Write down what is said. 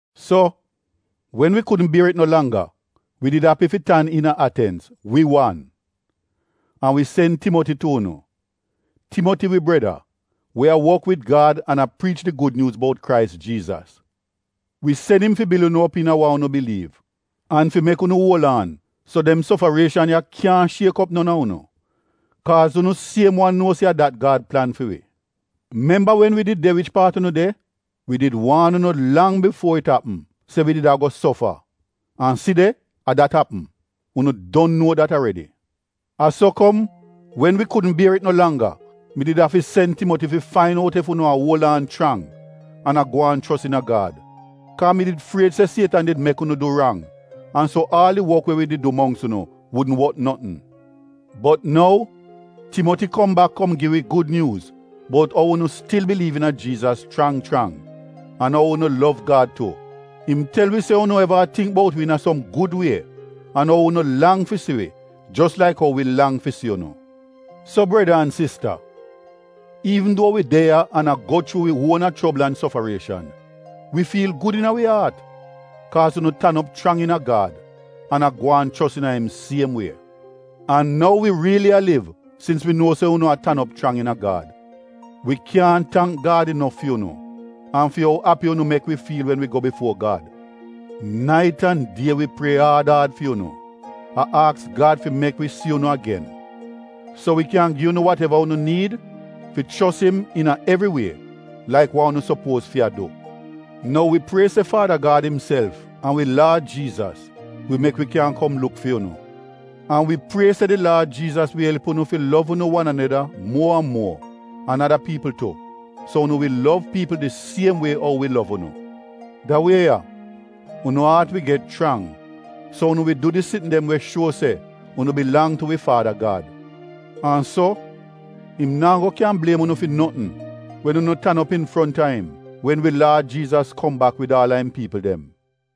So, wen wi kudn bier it no langga, wi did api fi tan iina Atenz — wi wan. An wi sen Timoti tu unu. Timoti wi breda, we a wok wid Gad an a priich di Gud Nyuuz bout Krais Jiizas. Wi sen im fi bil unu op iina wa unu biliiv, an fi mek unu kyan uol aan, so dem sofarieshan ya kyaahn shiek op non a unu. Kaaz unu siem wan nuo se a dat Gad plan fi wi. Memba wen wi did de wich paat unu de, wi did waan unu lang bifuo it apm se wi did ago sofa? An si de — a dat apm! Unu don nuo dat aredi. A so kom wen wi kudn bier it no langga mi did afi sen Timoti fi fain out ef unu a uol aan chrang an a gwaan chos iina Gad. Kaa mi did fried se Sietan did mek unu du rang an so aal di wok we wi did du mongks unu wudn wot notn. Bot nou Timoti kom bak kom gi wi gud nyuuz bout umoch unu stil biliiv iina Jiizas chrang chrang an ou unu lov Gad tu. Im tel wi se unu eva a tingk bout wi iina som gud wie, an ou unu lang fi si wi jos laik ou wi lang fi si unu. So breda an sista, iivn duo wi de ya an a go chuu wi uona chobl an sofarieshan, wi fiil gud iina wi aat, kaaz unu tan op chrang iina Gad an a gwaan chos iina im siem wie. An nou wi riili a liv sins wi nuo se unu a tan op chrang iina Gad. Wi kyaahn tangk Gad inof fi unu, an fi ou api unu mek wi fiil wen wi go bifuo Gad. Nait an die wi prie aad aad fi unu, a aks Gad fi mek wi si unu agen, so wi kyan gi unu wateva unu niid fi chos im iina evri wie, laik wa unu sopuoz fi a du. Nou wi prie se Faada Gad imself an wi Laad Jiizas wi mek wi kyan kom luk fi unu. An wi prie se di Laad Jiizas wi elp unu fi lov unu wan aneda muo an muo an ada piipl tu, so unu wi lov piipl di siem wie ou wi lov unu. Da wie ya, unu aat wi get chrang so unu wi du di sitn dem we shuo se unu bilang tu wi Faada Gad. An so im naa go kyan bliem unu fi notn wen unu tan op infronta im wen wi Laad Jiizas kom bak wid aal a im piipl dem.